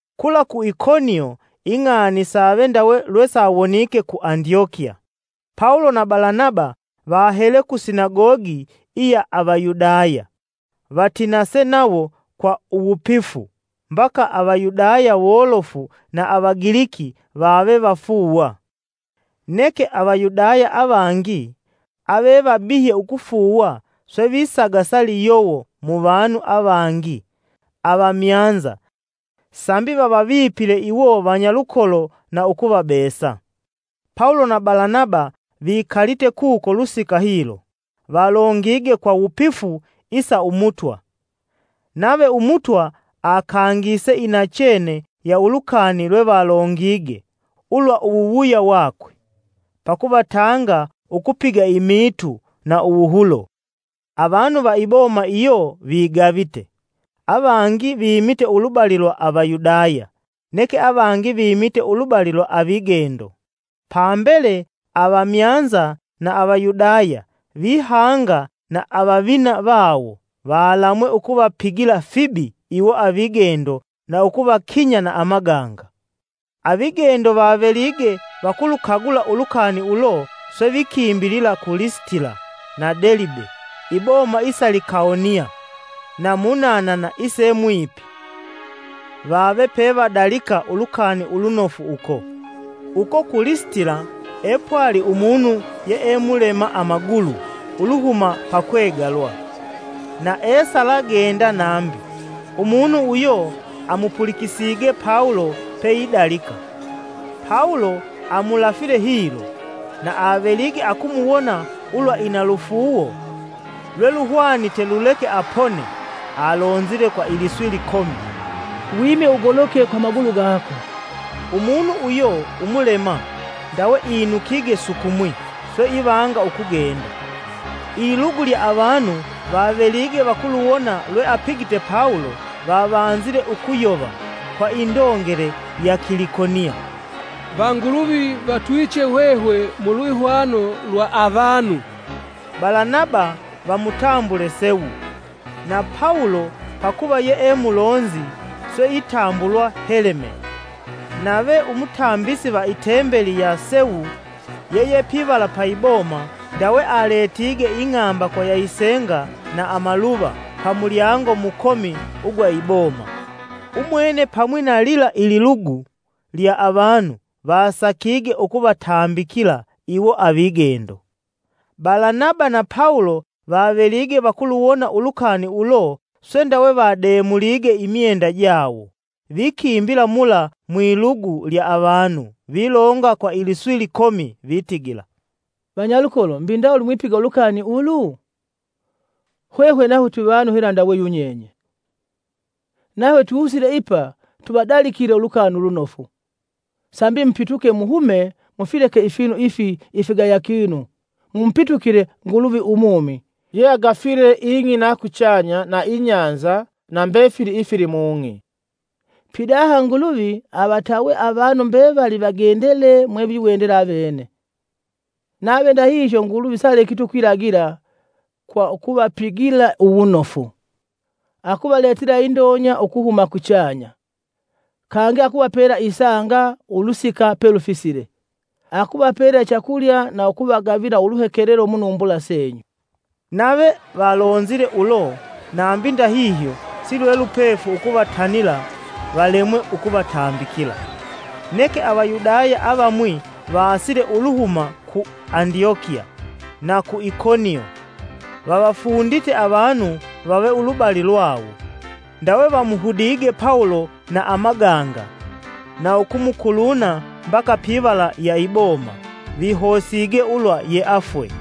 Kula ku Ikonio ing'ani save ndawe lwe sawonike ku Andyokiya. Pawulo na Balanaba vahele ku sinagogi iya Avayudaya vatinase nawo kwa uwupifu mbaka Avayudaya wolofu na Avagiliki vave vafuuwa. Neke Avayudaya avangi avevabihye ukufuuwa swe visagasa liyowo muvanu avangi avamyanza sambi vavavipile iwo vanyalukolo na ukuvabesa. Pawulo na Balanaba vikalite kuko lusika hilo. Valongige kwa wupifu isa Umutwa, nave Umutwa akangise inachene ya ulukani lwevalongige ulwa uwuwuya wakwe, pakuvatanga ukupiga imiitu na uwuhulo. Avanu va iboma iyo vigavite. Avangi vimite ulubali lwa Avayudaya, neke avangi vimite ulubali lwa avigendo. Pambele, avamyanza na Avayudaya, vihanga na avavina vawo, valamwe ukuvapigila fibi iwo avigendo na ukuvakinya na amaganga. Avigendo vavelige vakulukagula ulukani ulo, swe vikimbilila ku Lisitila na Delibe, iboma isa Likaonia, na munanana ise mwipi, vave wevadalika Ulukani Ulunofu uko. Uko ku Lisitila epwali umunu yee mulema amagulu uluhuma pakwegalwa, na esalagenda nambi. Umunu uyo amupulikisige Pawulo peidalika. Pawulo amulafile hilo, na avelige akumuwona ulwa ina lufuuwo lweluhwanite luleke apone, alonzile kwa iliswi likomi, “Wime ugoloke kwa amagulu gako!” Umunu uyo umulema ndawe inukige sukumwi, swe ivanga ukugenda. Ililugu lya avanu vavelige vakuluwona lweapigite Pawulo, vavanzile ukuyova kwa indongele ya Kilikonia: “Vanguluvi vatwiiche hwehwe mu lwihwano lwa avanu!” Balanaba vamutambule Sewu, na Pawulo pakuva yee mulonzi, swe itambulwa Heleme. Nave umutambisi va i Tembeli ya Sewu yeyepivala pa iboma ndawe aletige ing'ambakwa ya isenga na amaluva pamulyango mukomi ugwa iboma, umwene pamwi na lila ililugu lya avanu vasakige ukuvatambikila iwo avigendo. Balanaba na Pawulo vavelige vakuluwona ulukani ulo swe ndawe vademulige imyenda jawo vikimbila mula mwilugu lya avanu vilonga kwa iliswi likomi: Vitigila, “Vanyalukolo mbi ndawuli mwipiga ulukani ulu? Hwehwe nahwe twivanu hela ndawe yunyenye. Nahwe tusile ipa tuvadalikile ulukani ulunofu, sambi mupituke muhume mufileke ifinu ifi ifigayakinu mumupitukile Nguluvi umumi yeagafile ing'i na kuchanya na ibahali na mbefili ifilimung'i. Pidaha Nguluvi avatawe avanu mbevali vigendele mweviwendela vavene. Nave ndahihyo Nguluvi sialekiti ukwilagila kwa ukuvapigila uwunofu: akuvaletela indonya ukuhuma kuchanya, kangi akuvapela isanga ulusika pelufisile, akuvapela ichakulya na ukuvagavila uluhekelelo munumbula senyu.” Nave valonzile ulo nambi ndahihyo silwelupefu ukuvatanila valemwe ukuvatambikila. Neke Avayudaya avamwi vaasile uluhuma ku Andyokiya na ku Ikonio, vavafundite avanu vave ulubali lwawo, ndawe vamuhudige Pawulo na amaganga na ukumukuluna mbaka pivala ya iboma vihosige ulwa yeafwe.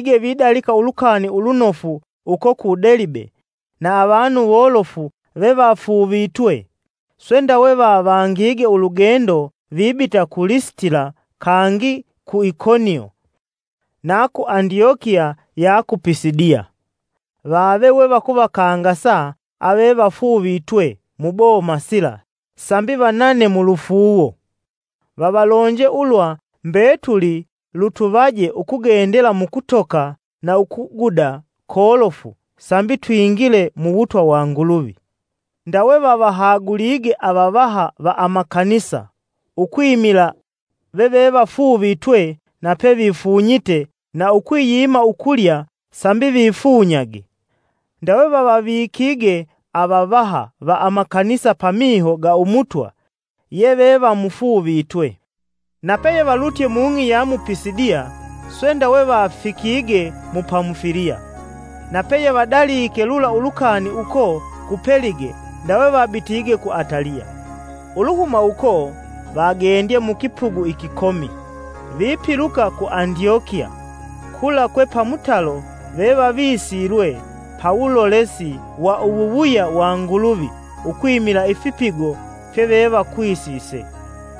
Pawulo na Balanaba vavelige vidalika ulukani ulunofu uko ku Delibe na avanu wolofu vevafuuvitwe, swe ndawe vavangige ulugendo vibita ku Lisitila kangi ku Ikonio na ku Andyokiya ya Pisidiya. Vave we vakuvakangasa avevafuuvitwe muboma sila sambi vanane mulufuuwo. Vavalonje, “Ulwa mbetuli lutuvaje ukugendela mukutoka na ukuguda kolofu sambi twingile muwutwa wa Nguluvi.” Ndawe vavahagulige avavaha va amakanisa ukwimila vevevafuuvitwe na pevifunyite na ukwiyima ukulya sambi vifunyage, ndawe vavavikige avavaha va amakanisa pamiho ga umutwa yevevamufuuvitwe. Na peyevalutye mung'i ya mu Pisidiya, swe ndawe vafikige mu Pamufiliya. Na peyevadalike lula ulukani uko ku Pelige, ndawe vabitige ku Ataliya. Uluhuma uko vagendye mukipugu ikikomi vipiluka ku Andyokiya kula kwe pamutalo vevavisilwe pawulolesi wa uwuwuya wa Nguluvi ukwimila ifipigo fye vevakwisise.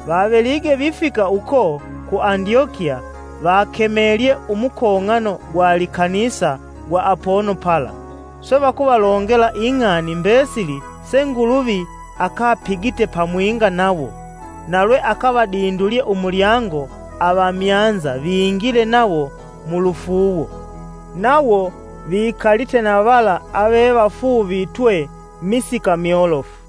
Vavelige vifika uko ku Andyokiya vakemelye umukong'ano gwa likanisa gwa apono pala, swe vakuvalongela ing'ani mbesili se Nguluvi akapigite pamwinga nawo, na lwe akavadindulye umulyango avamyanza vingile nawo mulufuuwo. Nawo vikalite na vala avevafuuvitwe kwa misika myolofu.